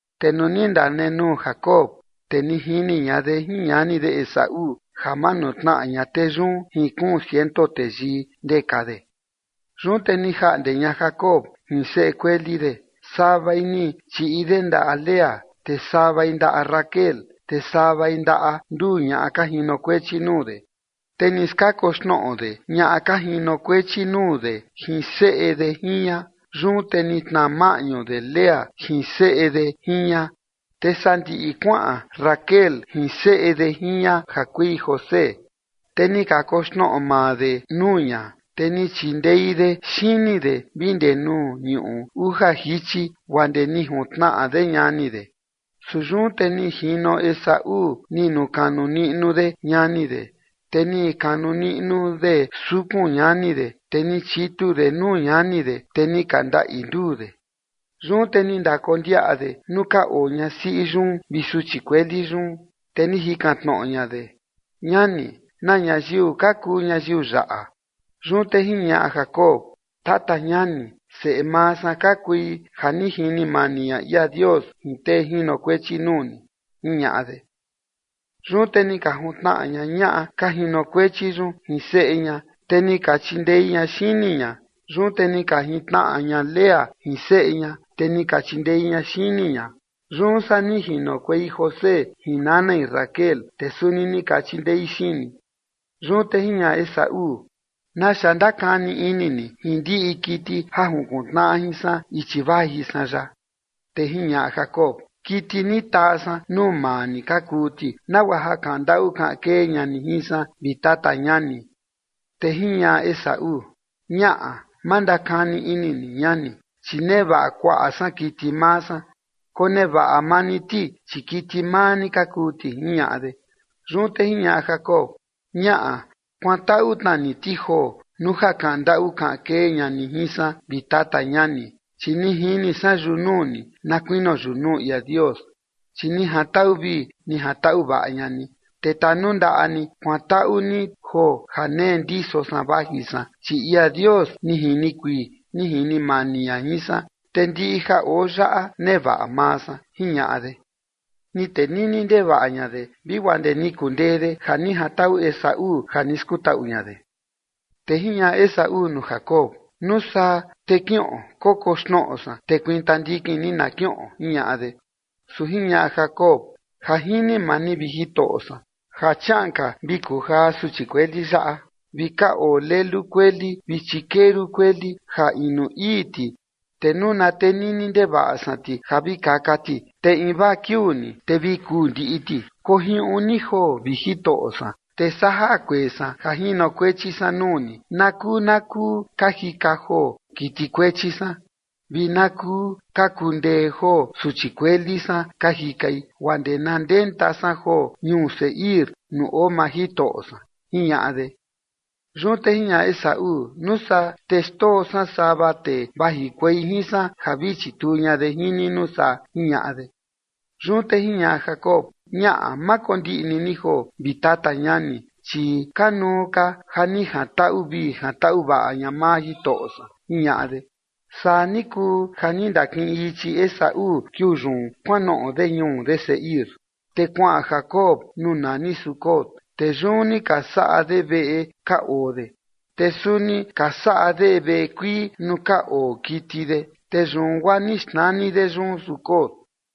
Te nuu ni ndanenuu Jacob, te ni jini ña de jin ñani de Esaú ja manutnaꞌa ña tee yun jin kuun ciento teyii ndeka de. Yun te ni jaꞌnde ña Jacob jin seꞌe kueli de, savai ni chiꞌi de ndaꞌa Lea, te savai ndaꞌa Raquel, te savai ndaꞌa nduu ñaꞌa ka jinokuechi nuu de. Te ni skakoxnoꞌo de ñaꞌa ka jinokuechi nuu de jin seꞌe de jin ña. Yun te ni tnaa maꞌñu de Lea jin seꞌe de jin ña, te sandiꞌi kuaꞌan Raquel jin seꞌe de jin ña ja kui José. Te ni kakoxnoꞌo maa de nuu ña, te ni chindei de xini de vi ndee nuu ñuꞌu uja jichi guaa ndee ni juntnaꞌa de ñani de. Su yun te ni jino Esaú ni nukanu niꞌnu de ñani de, te ni kanu niꞌnu de sukun ñani de, te ni chitu de nuu ñani de, te ni ka ndaꞌi nduu de. Yun te ni ndakondiaꞌa de nuu ka oo ñasiꞌi yun vi suchi kueli yun, te ni jikan tnoꞌo ña de: ―Ñani, ¿na ñayiu ka kuu ñayiu yaꞌa? Yun te jiñaꞌa Jacob: ―Tata ñani, seꞌe maa san ka kui ja ni jini mani ña ia Dios jin tee jinokuechi nuu ni ―jiñaꞌa de. Yun te ni ka juntnaꞌa ña ñaꞌa ka jinokuechi yun jin seꞌe ña, te ni ka chindei ña xini ña. Yun te ni ka jintnaꞌa ña Lea jin seꞌe ña, te ni ka chindei ña xini ña. Yun saa ni jinokuei José jin nanai Raquel, te suni ni ka chindei xini. Yun te jiñaꞌa Esaú: ―¿Naxa ndakani ini ni jin ndiꞌi kiti ja junkuntnaꞌa jin san ichi vaji san yaꞌa? Te jiñaꞌa Jacob: ―Kiti ni taa san nuu maa ni ka kuu ti, nagua ja kaꞌan ndaꞌu kaꞌan kee ña ni jin san, vi tata ñani. Te jiñaꞌa Esaú: ―Ñaꞌa, ma ndakani ini ni, ñani, chi nevaꞌa kuaꞌa san kiti maa san. Konevaꞌa maa ni ti, chi kiti maa ni ka kuu ti ―jiñaꞌa de. Yun te jiñaꞌa Jacob: ―Ñaꞌa, kuantaꞌu tna ni ti joo, nuu ja ni kaꞌan ndaꞌu ni kaꞌan kee ña ni jin san, vi tata ñani, chi ni jini san yunuu ni na kuinio yunuu ia Dios, chi ni jantaꞌu vii ni jantaꞌu vaꞌa ña ni. Te tanundaꞌa ni kuantaꞌu ni joo ja nee ndiso san vaji san, chi ia Dios ni jini kuii ni jini mani ña jin san, te ndiꞌi ja oo yaꞌa nevaꞌa maa san ―jiñaꞌa de. Ni tenini ndevaꞌa ña de vi guaa ndee ni kundee de ja ni jantaꞌu Esaú ja ni skutaꞌu ña de. Te jiñaꞌa Esaú nuu Jacob: ―Nuu saa te kiꞌon kokoxnoꞌo san, te kuinta ndikin ni na kiꞌon ―jiñaꞌa de. Su jiñaꞌa Jacob: ―Ja jini maa ni, vi jitoꞌo san, ja chiaꞌan ka vi kuu jaa suchi kueli yaꞌa vi ka oo lelu kueli vi chikeru kueli ja inu ii ti, te nuu na tenini ndevaꞌa san ti ja vi kaka ti, te invaa kiuu ni, te vi kuu ndiꞌi ti. Kojiuꞌun ni joo, vi jitoꞌo san, te saa jaa kuee san ja jinokuechi san nuu ni na kuu na kuu ka jika joo kiti kuechi san, vi na kuu ka kundee joo suchi kueli san ka jikai, guaa ndee na ndenta san joo ñuu Seir nuu oo maa jitoꞌo san ―jiñaꞌa de. Yun te jiñaꞌa Esaú: ―Nuu saa te xndoo san sava tee vajikuei jin san ja vi chituu ña de jin ni nuu saa ―jiñaꞌa de. Yun te jiñaꞌa Jacob: ―Ñaꞌa. Ma kondiꞌni ni joo, vi tata ñani, chi kanuu ka ja ni jantaꞌu vii jantaꞌu vaꞌa ña maa jitoꞌo san ―jiñaꞌa de. Saa ni kuu ja ni ndakiꞌin ichi Esaú kiuu yun kuanoꞌo de ñuu de Seir. Te kuaꞌan Jacob nuu nani Sucot, te yun ni ka saꞌa de veꞌe ka oo de, te suni ka saꞌa de veꞌe kuii nuu ka oo kiti de, te yun guaa ni xnani de yun Sucot.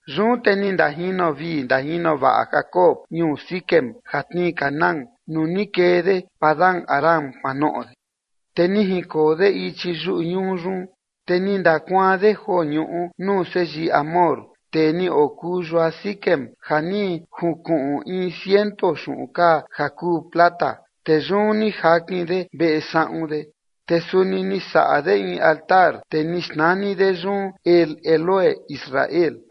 Yun te ni ndajino vii ndajino vaꞌa Jacob ñuu Siquem ja tnii Canaán nuu ni kee de Padan-aram kuanoꞌo de, te ni jinkoo de ichi yuꞌu ñuu yun. Te ni ndakuaan de joo ñuꞌu nuu seyii Hamor, tee ni okuu yua Siquem, ja ni junkuꞌun in ciento xuꞌun kaa ja kuu plata, te yun ni jakin de veꞌe saꞌun de. Te suni ni saꞌa de in altar, te ni xnani de yun El Elohe Israel.